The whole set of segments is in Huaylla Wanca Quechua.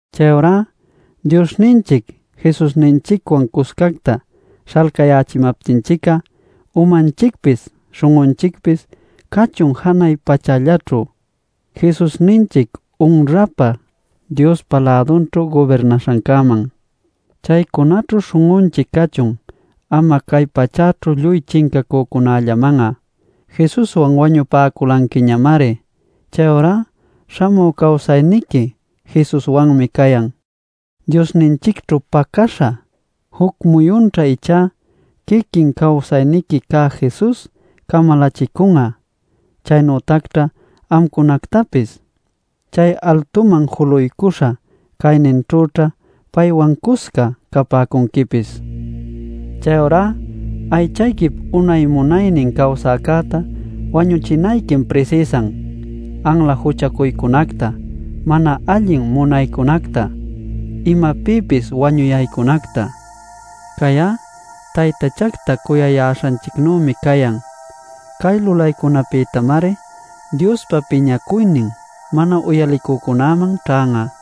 Chayurá Diosninchic Jesusninchicwan cuscacta śhalcayächimaptinchic'a umanchicpis śhun'unchicpis cachun janay pachällaćhu, Jesusninchic unrapä Diospa lädunćhu gubirnaśhancäman. Chaycunaćhu śhun'unchic cachun ama cay pachäćhu lluy chincacücunällaman'a. Jesuswan wañupäculanquiñamari; chayurá śhamü cawsayniqui Jesuswanmi cayan, Diosninchicćhu pacäśha. Juc muyunćha ichá quiquin cawsayniqui cä Jesus camalächicun'a, chaynütacćha amcunactapis. Chay altuman juluycuśha cayninćhüćha paywan cusca capäcunquipis. Chayurá aychayquip unay munaynin cawsäcäta wañuchinayquim prisïsan: anla juchacuycunacta, mana allin munaycunacta, imapïpis wañuyaycunacta. Cay'á taytachacta cuyayäśhanchicnümi cayan. Cay lulaycunapïtamari Diospa piñacuynin mana uyalicücunäman ćhan'a.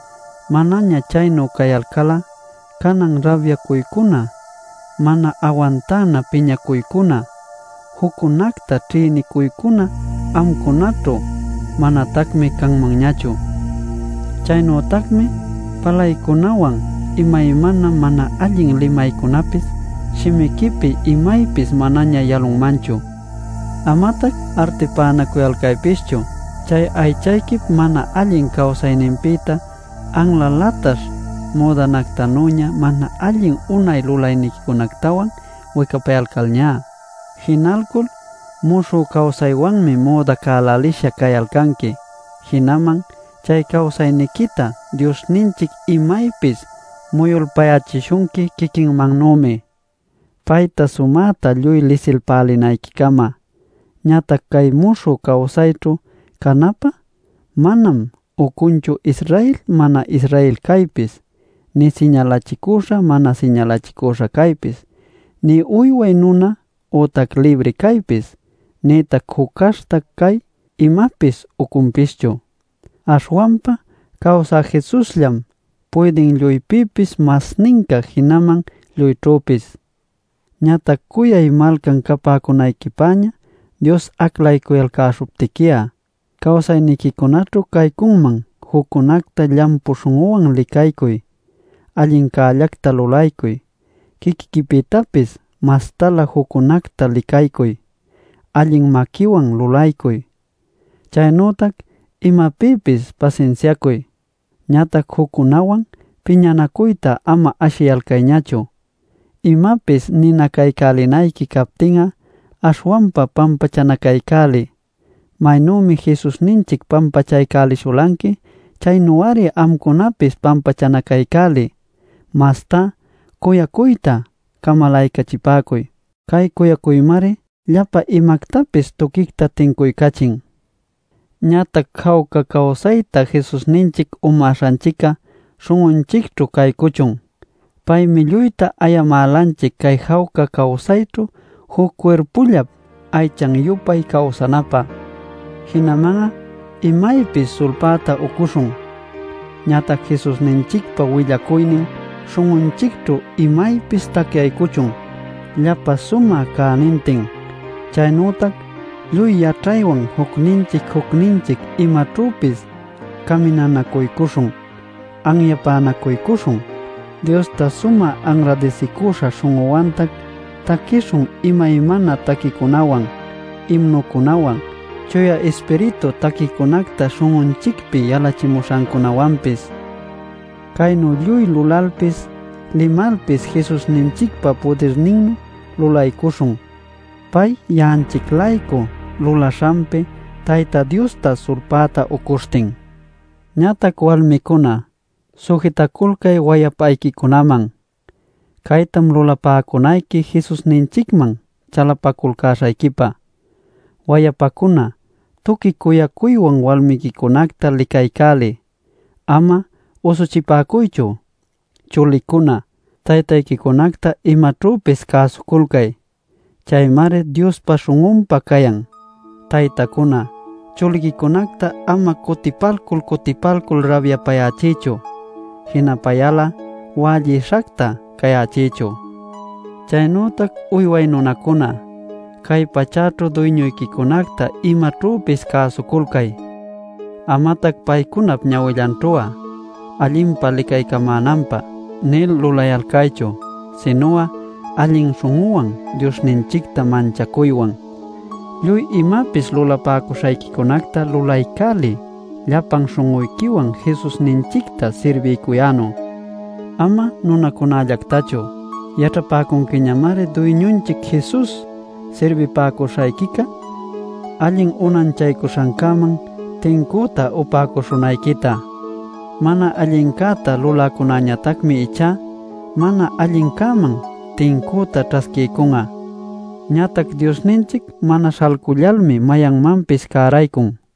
Manaña chaynu cayalcal'a canan rabyacuycuna, mana awantana piñacuycuna, juccunacta ćhïnicuycuna amcunaćhu manatacmi canmanñachu. Chaynütacmi palaycunawan imaymana mana allin limaycunapis shimiquipi imaypis manaña yalunmanchu. Amatac artipänacuyalcaypischu chay aychayquip mana allin cawsayninpïta anla lataśh müdanactanüña mana allin unay lulaynincunactawan wicapayalcalñá. Jinalcul muśhü cawsaywanmi müdacälälisha cayalcanqui. Jinaman chay cawsayniquita Diosninchic imaypis muyulpayächishunqui quiquinmannümi, payta sumäta lluy lisilpälinayquicama. Ñatac cay muśhü cawsayćhu canapä manam ucunchu Israel mana-Israel caypis, nï siñalachicuśha mana siñalachicüśha caypis, nï uyway nuna ütac libri caypis, nïtac juc caśhta cay imapis ucunpischu. Aśhwanpa cawsä Jesusllam puydin lluypïpis masninca jinaman lluyćhüpis. Ñatac cuyay malcan capäcunayquipäña Dios aclaycuyalcäśhuptiqui'a, cawsayniquicunaćhu caycunman juccunacta llampu śhun'uwan licaycuy, allincällacta lulaycuy, quiquiquipïtapis mastalä juccunacta licaycuy, allin maquiwan lulaycuy, chaynütac imapïpis pasinsiacuy. Ñatac juccunäwan piñanacuyta ama ashiyalcayñachu, imapis ninacaycälinayqui captin'a aśhwanpa pampachanacaycäliy. Maynümi Jesusninchic pampachaycälishulanqui, chaynu-ari amcunapis pampachanacaycäliy. Mastá cuyacuyta camalaycachipäcuy; cay cuyacuymari llapa imactapis tuquicta tincuycachin. Ñatac jawca cawsayta Jesusninchic umäśhanchicca śhun'unchicćhu caycuchun. Paymi lluyta ayamälanchic cay jawca cawsayćhu juc cuirpullap aychan-yupay cawsanapä. Jinaman'a imaypis sulpäta ucuśhun. Ñatac Jesusninchicpa willacuynin śhun'unchicćhu imaypis tacyaycuchun llapa sumä cänintin. Chaynütac lluy yaćhaywan jucninchic jucninchic imaćhüpis caminanacuycuśhun, anyapänacuycuśhun. Diosta sumä anradisicüśha śhun'uwantac, taquishun imaymana taquicunawan, imnucunawan, Chuya Ispiritu taquicunacta śhun'unchicpi yalachimuśhancunäwanpis. Caynu lluy lulalpis, limalpis Jesusninchicpa pudirninnu lulaycuśhun, pay ya'anchic-laycu lulaśhanpi Tayta Diosta sulpäta ucuśhtin. Ñatac walmicuna, sujitaculcay wayapayquicunaman; caytam lulaycälinayqui Jesusninchicman chalapaculcäśhayquipa. Wayapacuna, tuqui cuyacuywan walmiquicunacta licaycäliy; ama usuchipäcuychu. Chulicuna, taytayquicunacta imaćhüpis cäsuculcay; caymari Diospa śhun'unpä cayan. Taytacuna, chuliquicunacta ama cutipalcul cutipalcul rabyapayächiychu, jinapayal'a wällïshacta cayächiychu. Chaynütac uyway nunacuna, cay pachäćhu duyñuyquicunacta imaćhüpis cäsuculcay. Amatac paycunap ñawillanćhu'a, “allinpa licaycamänanpä” nil lulayalcaychu, sinu'a allin śhun'uwan Diosninchicta manchacuywan. Lluy imapis lulapäcuśhayquicunacta lulaycäliy llapan śhun'uyquiwan Jesusninchicta sirbiycuyänu, ama nunacunällactachu. Yaćhapäcunquiñamari Duyñunchic Jesus sirbipäcuśhayquica allin unanchaycuśhancäman tincüta upäcuśhunayquita. Mana allincäta luläcäñatacmi ichá, mana allincäman tincüta ćhasquiycun'a. Ñatac Diosninchic mana śhalcullalmi mayanmanpis cäraycun.